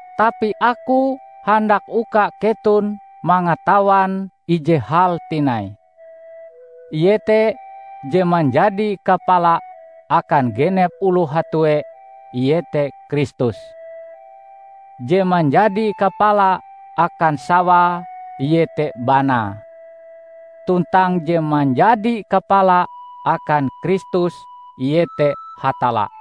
Tapi aku handak uka keton mangatawan ije hal tinai, iete je manjadi kapala akan genep oloh hatue iete Kristus; je manjadi kapala akan sawae iete banae, tuntang je manjadi kapala akan Kristus iete Hatalla.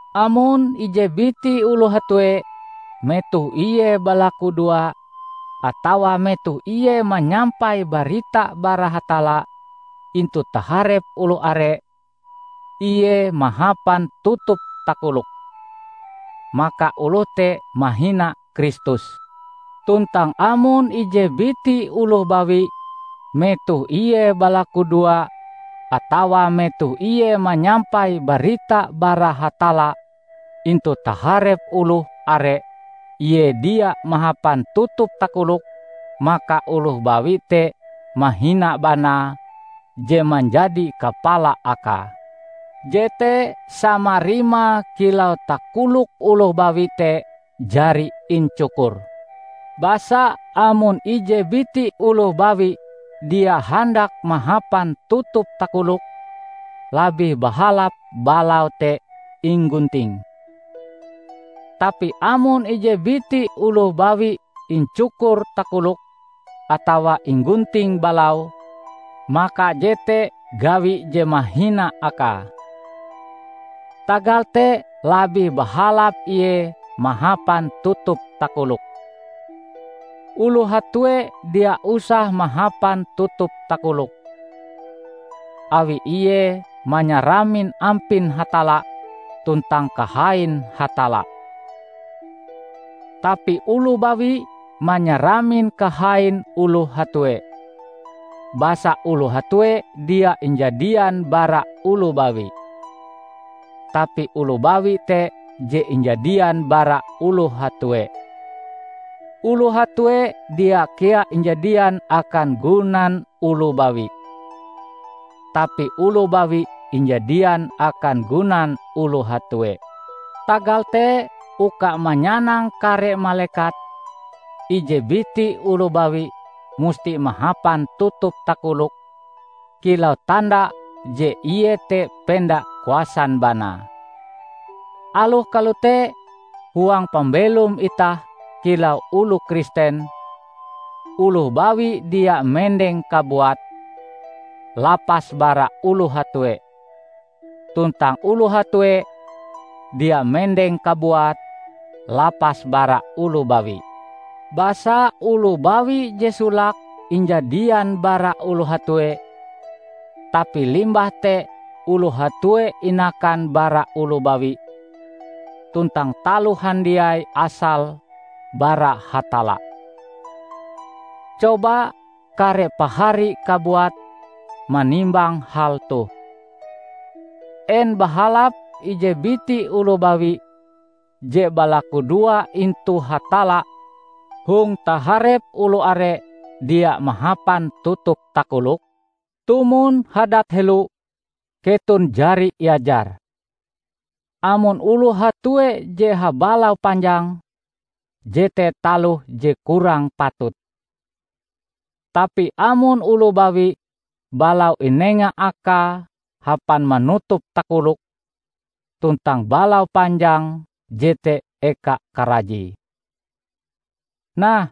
Amon ije biti oloh hatue metoh ie balakudoa atawae metoh ie manyampai barita bara Hatalla intu taharep oloh are, ie mahapan tutup takolok, maka oloh te mahina Kristus. Tuntang amon ije biti oloh bawi metoh ie balakudoa atawa metoh ie manyampai barita bara Hatalla intu taharep oloh are ie dia mahapan tutup takolok, maka oloh bawi te mahina banae je manjadi kapala akae. Jete sama rimae kilau takolok oloh bawi te jari incukur. Basa amon ije biti oloh bawi dia handak mahapan tutup takolok, labih bahalap balaue te inggunting. Tapi amon ije biti oloh bawi incukur takoloke atawa inggunting balaue, maka jete gawi je mahina akae. Tagal te labih bahalap ie mahapan tutup takolok. Oloh hatue dia usah mahapan tutup takolok, awi ie manyaramin ampin Hatalla tuntang kahain Hatalla. Tapi oloh bawi manyaramin kahain oloh hatue, basa oloh hatue dia injadian bara oloh bawi, tapi oloh bawi te je injadian bara oloh hatue. Oloh hatue dia kea injadian akan gunan oloh bawi, tapi oloh bawi injadian akan gunan oloh hatue. Tagal te uka manyanang kare malekat, ije biti oloh bawi musti mahapan tutup takolok kilau tanda je ie te penda kuasan banae. Aloh kalote, huang pambelom itah kilau oloh Kristen, oloh bawi dia mendeng kabuate, lapas bara oloh hatue, tuntang oloh hatue dia mendeng kabuate, lapas bara oloh bawi. Basa oloh bawi je solake injadian bara oloh hatue, tapi limbah te oloh hatue inakan bara oloh bawi; tuntang taloh handiai asale bara Hatalla. Coba kare pahari kabuat manimbang hal toh: en bahalap ije biti oloh bawi je balakudoa intu Hatalla hong taharep oloh are, dia mahapan tutup takolok? Tumon hadat helo, keton jari iajar, amon oloh hatue je habalau panjang, jete taloh je kurang patut. Tapi amon oloh bawi, balau inenga akae hapan manutup takoloke tuntang balau panjang jete eka karajie. Nah,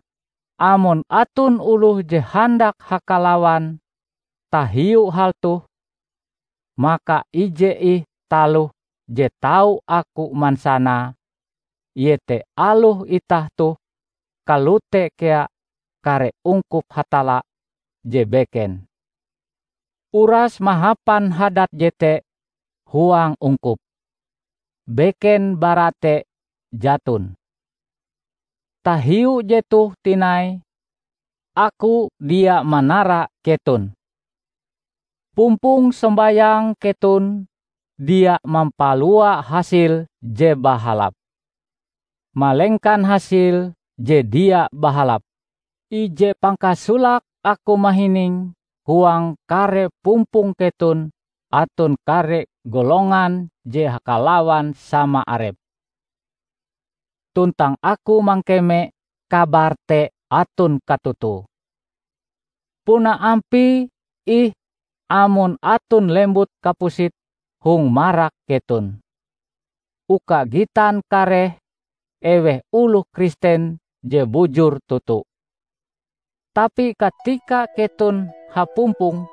amon aton oloh je handak hakalawan tahiu hal toh, maka ije ih taloh je tau aku mansanae iete aloh itah toh kalote kea kare ungkup Hatalla je beken, uras mahapan hadat jete huang ungkup; beken bara te jaton. Tahiu jetoh tinai, aku dia manara keton. Pumpong sombayang keton dia mampalua hasil je bahalap, malengkan hasil je dia bahalap. Ije pangkasolake aku mahining huang kare pumpong keton aton kare golongan je hakalawan sama arepe. Tuntang aku mangkeme kabar te aton katotoe. Puna ampie ih amon aton lembut kapusit hong marak keton, uka gitan kareh eweh oloh Kristen je bujur toto. Tapi katika keton hapumpong,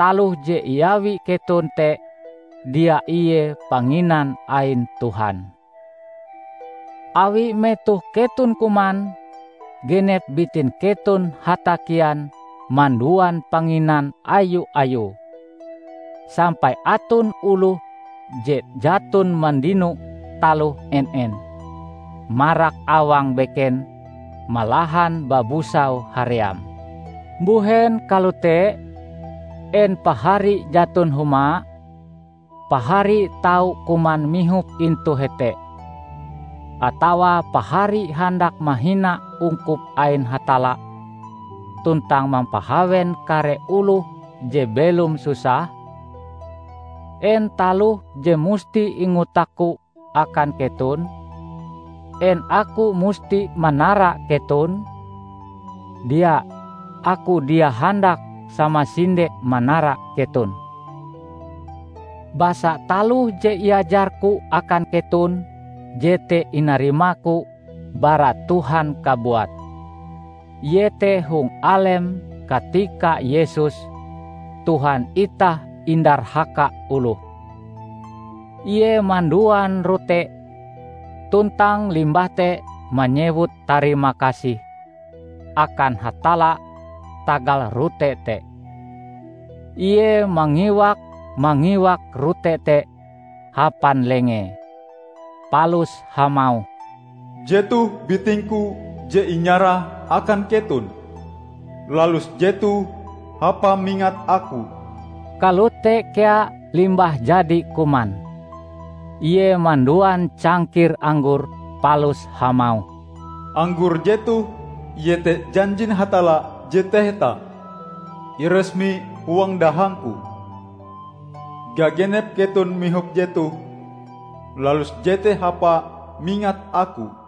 taloh je iawi keton te dia ie Panginan ain Tuhan. Awi metoh keton kuman, genep bitin keton hatakian manduan panginan ayu-ayue, sampai aton oloh je jaton mandino taloh en-en, marak awang beken malahan babusau haream. Mbuhen kalote? En pahari jaton huma? Pahari tau kuman mihop intu hete! Atawa pahari handak mahina ungkup ain Hatalla tuntang mampahawen kare oloh je belom susah? En taloh je musti ingotakku akan keton? En aku musti manara keton? Dia! Aku dia handak samasinde manara keton. Basa taloh je iajarku akan keton, jete inarimaku bara Tuhan kabuat: iete hong alem katika Yesus, Tuhan itah indarhaka oloh, Ie manduan rote, tuntang limbah te manyewut tarimakasih akan Hatalla tagal rote te, Ie mangiwak-mangiwak rote te hapan lengee, palus hamauh, "Jetoh biting-Ku je inyarah akan keton. Lalus jetoh hapa mingat aku." Kalote kea limbah jadi kuman, ie manduan cangkir anggor palus hamauh, "anggor jetoh iete janjin Hatalla je taheta, iresmi huang dahang-Ku. Gagenep keton mihop jetoh, lalus jete hapa mingat Aku."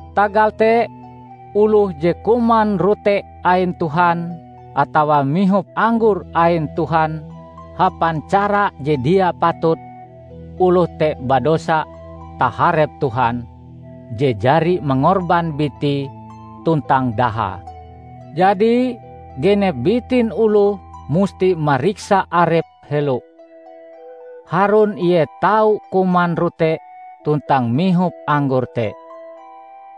Tagal te, oloh je kuman rote ain Tuhan atawa mihop anggor ain Tuhan hapan cara je dia patut, oloh te badosa taharep Tuhan je jari mangorban bitie tuntang dahae. Jadi, genep bitin oloh musti mariksa arepe helo, harun ie tau kuman rote tuntang mihop anggor te.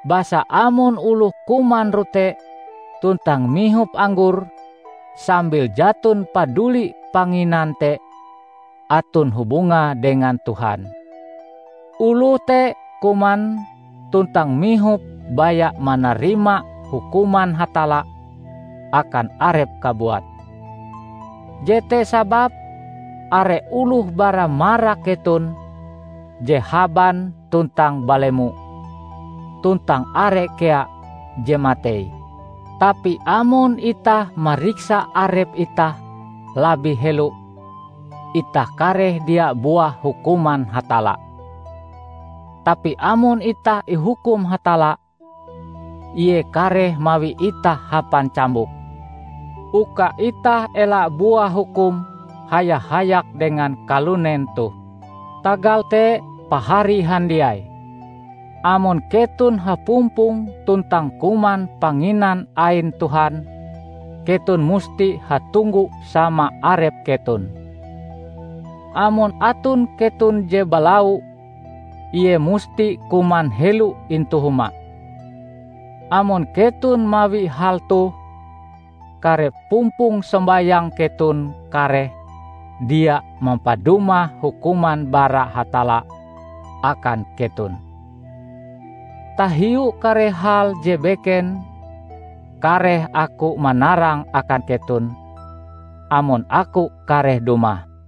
Basa amon oloh kuman rote tuntang mihop anggor sambil jaton paduli panginan te aton hubungae dengan Tuhan, oloh te kuman tuntang mihop baya manarima hukuman Hatalla akan arepe kabuat. Jete sababe are oloh bara marak keton je haban tuntang balemo, tuntang are kea je matei. Tapi amon itah mariksa arep itah labih helo, itah kareh dia buah hukuman Hatalla. Tapi amon itah ihukum Hatalla, Ie kareh mawi itah hapan cambuk, uka itah ela buah hukum haya-hayak dengan kalunen toh. Tagal te pahari handiai, amon keton hapumpong tuntang kuman Panginan ain Tuhan, keton musti hatunggu sama arep keton. Amon aton keton je balau, ie musti kuman helo intu huma. Amon keton mawi hal toh, kare pumpong sombayang keton kareh dia mampadumah hukuman bara Hatalla akan keton. Tahiu kare hal je beken, kareh aku manarange akan keton, amon aku kareh dumah.